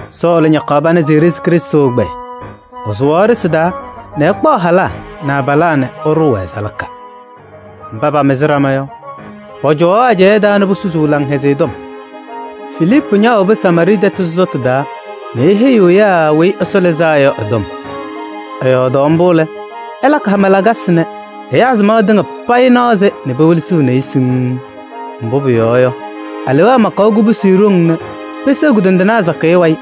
Sɔɔlɩ ñakaɣ pana se eɖezi Krɩstʋ ɛgbɛyɛ: ɛsʋwaɣ ɖɩsɩ taa nɛ ɛkpaɣ halaa nɛ abalaa nɛ ɛɖʋʋ-wɛ salaka. Mba paamɩzɩ ɖama yɔ, pɔcɔwaɣ ɛjaɖɛ taa nɛ posusuu Laŋhɛzɩyɛ Tɔm. Filiipu ñaawobi Samaarɩɩ tɛtʋ sɔsɔtʋ taa nɛ eheyiɣ ɛyaa Weyi Ɛsɔ Lɩzaa Yɔ ɛ-tɔm. Ɛyɔɔdaɣ mbʋ lɛ, ɛlakɩ hama lakasɩ nɛ ɛyaa samaɣ tɩŋa payɩ naɣ-sɩ nɛ pewelesiɣni-i siŋŋ. Mbʋ pʋyɔɔ yɔ, alewaa makaɣ kubusi ɖoŋ nɛ peseɣ kʋdɔndɩnaa sakɩyɛ wayɩ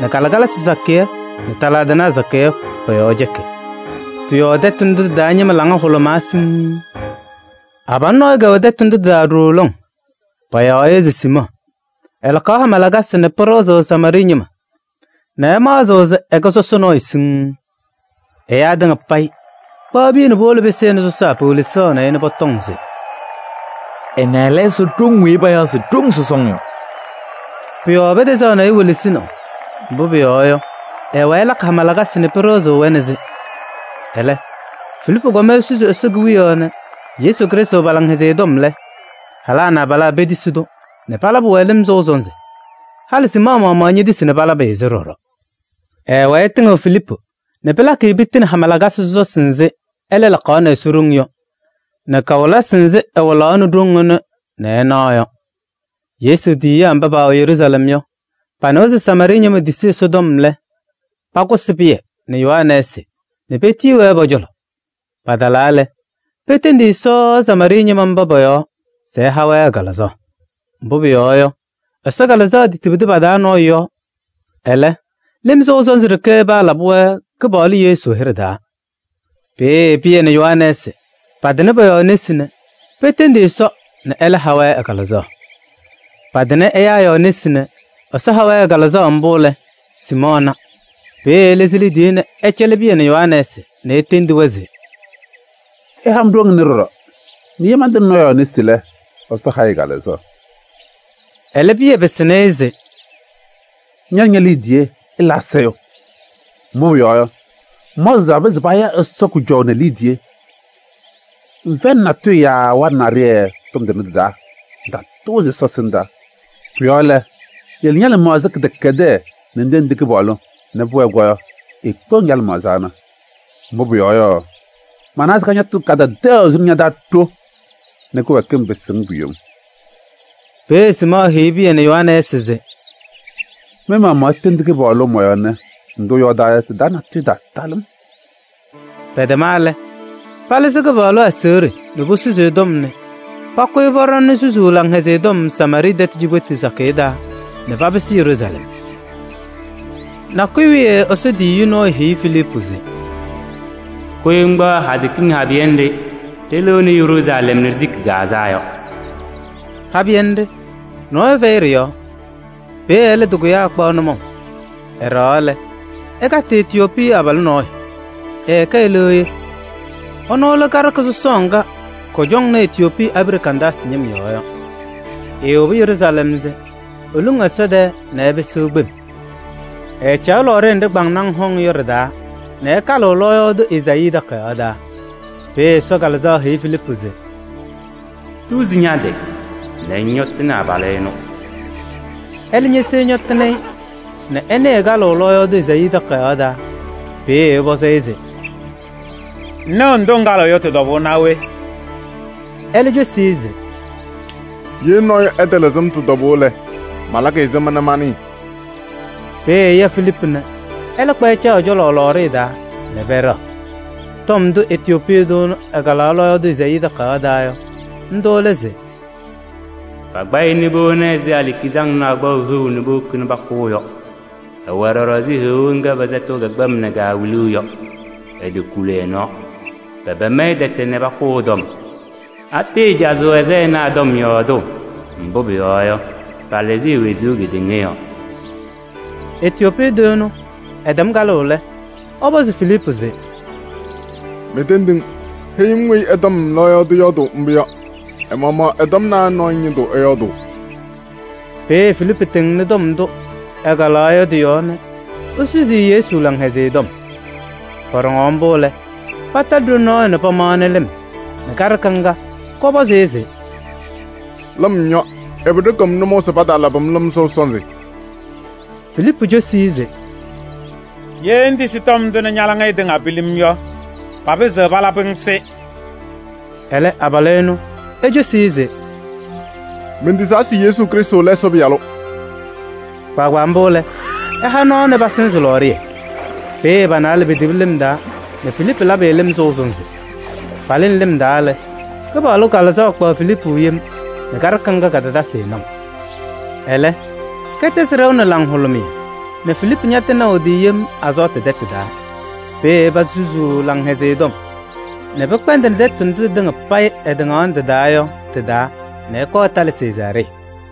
nɛ kalɩkalasɩ sakɩyɛ nɛ taladɩnaa sakɩyɛ pɔ-yɔɔ cɛkɩ. Pʋ-yɔɔ tɛtʋ ndʋ tɩ-taa ñɩma laŋa hʋlʋmaa siŋŋ. Abalʋ nɔɔyʋ kɛwɛ tɛtʋ ndʋ tɩ-taa ɖooo lɔŋ, payaɣ-ɩ se Siimɔɔ. Ɛlakaɣ hama lakasɩ nɛ pɩɖɩɣzɩɣ Samaarɩɩ ñɩma nɛ ɛmaɣzɩɣ se ɛkɛ sɔsɔ nɔɔyʋ siŋŋ. Ɛyaa tɩŋa payɩ, kpaɣ piya nɛ puwolo pɩsɩnɩ sɔsaa pewelesaɣnɩ-ɩ nɛ pɔtɔŋ se: “Ɛnɛ lɛ Ɛsɔ ɖoŋ weyi payaɣ se: ‘Ɖoŋ sɔsɔŋ’ yɔ.” Pʋ-yɔɔ pɛtɛzaɣ-ɩ welesinaʋ, mbʋ pʋyɔɔ yɔ, ɛwɛɛ ɛlakɩ hama lakasɩ nɛ pɩɖɩɣzɩɣ-wɛ nɛ sɩ. Ɛlɛ, Filiipu kɔm esusi Ɛsɔ Kewiyaɣ nɛ Yesu Krɩstʋ pa-Laŋhɛzɩyɛ tɔm lɛ, halaa nɛ abalaa petisi-tʋ nɛ palabɩ-wɛ lɩm sɔʋ sɔnzɩ. Halɩ Siimɔɔ maɣmaɣ ñetisi nɛ palabɩ-ɩ-sɩ ɖɔɖɔ. Ɛɛwɛɛ ɛtɩŋɩɣ Filiipu nɛ pɩlakɩ-ɩ piti nɛ hama lakasɩ sɔsɔsɩ nzɩ ɛlɛ lakaɣnɩ Ɛsɔ ɖoŋ yɔ nɛ kawɩlɩsɩ nzɩ ɛwɩlaɣnɩ ɖoŋ ɛnʋ nɛ ɛnaɣ yɔ. Yesu tiyiyaa mba paawɛ Yeruusalɛm yɔ, panɩwa se Samaarɩɩ ñɩma tisi Ɛsɔtɔm lɛ, pakʋsɩ Pɩyɛ nɛ Yohanɛɛsɩ nɛ petiyi-wɛ pɔ-cɔlɔ. Paba talaa lɛ, petendi Ɛsɔ Samaarɩɩ ñɩma mba pɔ-yɔɔ se ɛha-wɛ ɛ-Kalɩzaɣ. Mbʋ pʋyɔɔ yɔ, Ɛsɔ Kalɩzaɣ tetibidi pa-taa nɔɔyʋ yɔɔ. Ɛlɛ, lɩm sɔʋ sɔnzɩ ɖeke paalabɩ-wɛ Kɩpaɣlʋ Yesu hɩɖɛ taa. Peeye Pɩyɛ nɛ Yohanɛɛsɩ patɩnɩ pɔ-yɔɔ nesi nɛ petendi Ɛsɔ nɛ ɛlɛ ha-wɛ ɛ-Kalɩzaɣ. Patɩnɩ ɛyaa yɔɔ nesi nɛ Ɛsɔ ha-wɛ ɛ-Kalɩzaɣ mbʋ lɛ, Siimɔɔ na. Peeye ɛlɩzɩ liidiye se ɛcɛlɩɣ Pɩyɛ nɛ Yohanɛɛsɩ nɛ etendi-wɛ se: “Ɩha-m ɖoŋ ɛnʋ ɖɔɖɔ nɛ ye mantɩnɩ nɔɔyʋ yɔɔ nesi lɛ, Ɛsɔ ha-ɩ ɛ-Kalɩzaɣ.” Ɛlɛ, Pɩyɛ pɩsɩnɩ-ɩ se: “Ña nɛ ñe-liidiye ɩla asayʋʋ! Mbʋ pʋyɔɔ yɔ, ŋmaɣzɩɣ se papɩzɩɣ paya Ɛsɔ kʋjɔʋ nɛ liidiye. Ŋfɛyɩnɩ natʋyʋ yaa waɖɛ naɖɩyɛ tɔm tʋnɛ tɩ-taa, ŋtatʋʋzɩ Ɛsɔ ɛsɩndaa. Pʋ-yɔɔ lɛ, yele ña-lɩmaɣza kɩdɛkɛdɛɛ nɛ ŋtendi Kɩpaɣlʋ nɛ pʋwɛɛ yɔ, eekpeɣ-ŋ ña-lɩmaɣza ana. Mbʋ pʋyɔɔ yɔ, manawa se kañatʋ kadadaɣyaɣ suni ña-taa ɖo nɛ kɩwɛɛkɩm pɩsɩ-ŋ pu-yom.” Peeye Siimɔɔ heyi Pɩyɛ nɛ Yohanɛɛsɩ se: “Mɩ-maɣmaɣ itendi Kɩpaɣlʋ mɔ-yɔɔ nɛ ndʋ ɩyɔɔdaa yɔ, tɩ-taa natʋyʋ ɛtaatalɩ-m.” Pɛtɛma lɛ, palɩzɩ Kɩpaɣlʋ aseɣɖe nɛ posusi ɛ-tɔm nɛ pakʋyɩ pɔɖɔŋnɩ susuu Laŋhɛzɩyɛ Tɔm Samaarɩɩ tɛtʋ cikpetu sakɩyɛ taa nɛ papɩsɩ Yeruusalɛm. Nakʋyʋ wiye Ɛsɔ tiyiyu nɔɔyʋ heyi Filiipu se: “Kʋyɩ ŋkpaɣ hadɛ kiŋ habɩyɛ nɖɩ ɖɩlɩɣnɩ Yeruusalɛm nɛ ɖitiki Gaazaa yɔ.” Habɩyɛ nɖɩ, nɔɔyʋ fɛyɩ ɖɩ-yɔɔ. Peeye ɛlɛ tɩkʋyaa ɛkpaɣ nʋmɔʋ. Ɛɖɛɣaɣ lɛ, ɛkatɩ Etiyoopii abalʋ nɔɔyʋ, ɛkɛ eleɣye. Ɛnʋ lɛ karɩka sɔsɔɔ ŋga kɔcɔŋnɩ Etiyoopii abiɖe Kandaasɩ ñɩm yɔɔ yɔ. Eewobi Yeruusalɛm se eluŋ Ɛsɔ tɛɛ nɛ ɛpɩsɩɣ kpem. Ɛɛcaɣ lɔɔɖɩyɛ nɖɩ kpaŋnaŋ hɔŋ yɔ ɖɩ-taa nɛ ɛkalɩɣ lɔɔyaɣ tʋ Ezaayii takayaɣ taa. Peeye Ɛsɔ Kalɩzaɣ heyi Filiipu se: “Tuzi ña-tɩ nɛ ŋñɔtɩnɩ abalʋ ɛnʋ.” Ɛlɛ ñese ɛñɔtɩnɩ-ɩ nɛ ɛnɩɣ ɛkalɩɣ lɔɔyaɣ tʋ Ezaayii takayaɣ taa. Peeye ɛpɔzɩ-ɩ se: “Ŋnɩɣ ndʋ ŋkalɩɣ yɔ tɩ-tɔbʋʋ naa we?” Ɛlɛ cosi-i se: “Ye nɔɔyʋ ɛtalɩzɩ-m tɩ-tɔbʋʋ lɛ, malakɩ ɛzɩma nɛ manɩɩ?” Peeye ɛya Filiipu nɛ ɛlɛ kpa ɛcaɣ ɛ-cɔlɔ lɔɔɖɩyɛ taa nɛ pɛɖɛɣ. Tɔm ndʋ Etiyoopii tʋ ɛnʋ ɛkalaɣ lɔɔyaɣ tʋ Ezaayii takayaɣ taa yɔ, ndʋ lɛ se: “Pakpa-ɩ nɛ powoni-i ɛzɩ alikizaŋnaa kpaʋ heu se powokini kʋʋ yɔ. Ɛwɛ ɖɔɖɔ ɛzɩ heɣa ŋga pɛsɛtɩɣ kɛ-kpɛm nɛ kaawiliɣ yɔ. Etokuli ɛ-nɔɔ. Pɛpɛɛŋ-ɩ tɛtɛ nɛ pakʋ ɛ-tɔm. Atɩɩcazɩɣ ɛ-sayɩnaa tɔm yɔɔdʋʋ? Mbʋ pʋyɔɔ yɔ, palɩzɩ e-wezuu kedeŋa yɔɔ.” Etiyoopii tʋ ɛnʋ ɛtɛm kalʋʋ lɛ, ɛpɔzɩ Filiipu se: “Mentendi-ŋ, heyi-m weyi ɛ-tɔm lɔɔyaɣ tʋ yɔɔdʋʋ mbʋ yɔ. Ɛ-maɣmaɣ ɛ-tɔm naa nɔɔyʋ ñɩndʋ ɛyɔɔdʋʋ?” Peeye Filiipu tɩŋnɩ tɔm ndʋ ɛkalaɣ yɔ tɩ-yɔɔ nɛ esusi-i Yesu Laŋhɛzɩyɛ Tɔm. Pɔɖɔŋaɣ mbʋ lɛ, patalɩ ɖoli nɔɔyʋ nɛ pamaɣnɩ lɩm nɛ kaɖɩka ŋga kɔpɔzɩ-ɩ se: “Lɩm yɔ! Ɛbɛ ɖɩkɩɣ-m nʋmɔʋ se pataalabɩ-m lɩm sɔʋ sɔnzɩ?” [ Filiipu cosi-i se: “Ye ŋtisi tɔm ndʋ nɛ ña-laŋɩyɛ tɩŋa pilim yɔ, papɩzɩɣ palabɩ-ŋ-sɩ.” Ɛlɛ abalʋ ɛnʋ ecosi-i se: “Mentisaa se Yesu Krɩstʋ lɛ Ɛsɔ Pɩyalʋ.”] Kpaagbaa mbʋ lɛ, ɛha nɔɔ se pasɩzɩ lɔɔɖɩyɛ. Peeye pa-naalɛ petibi lɩm taa nɛ Filiipu labɩ-ɩ lɩm sɔʋ sɔnzɩ. Palɩnɩ lɩm taa lɛ, Kɩpaɣlʋ Kalɩzaɣ kpaɣ Filiipu yem nɛ kaɖɩka ŋga katatasɩ-ɩ naʋ. Ɛlɛ kɛtɛzɩ ɖɛʋ nɛ laŋhʋlʋmɩyɛ nɛ Filiipu ñatɩnaʋ ɛ-tɩ yem Azɔɔtɩ tɛtʋ taa. Peeye ɛpazɩ susuu Laŋhɛzɩyɛ Tɔm nɛ pɩkpɛndɩnɩ tɛtʋ ndʋ tɩtɩŋa payɩ ɛtɩŋaɣnɩ tɩ-taa yɔ tɩ-taa nɛ ɛkɔɔ ɛtalɩ Sezaaree.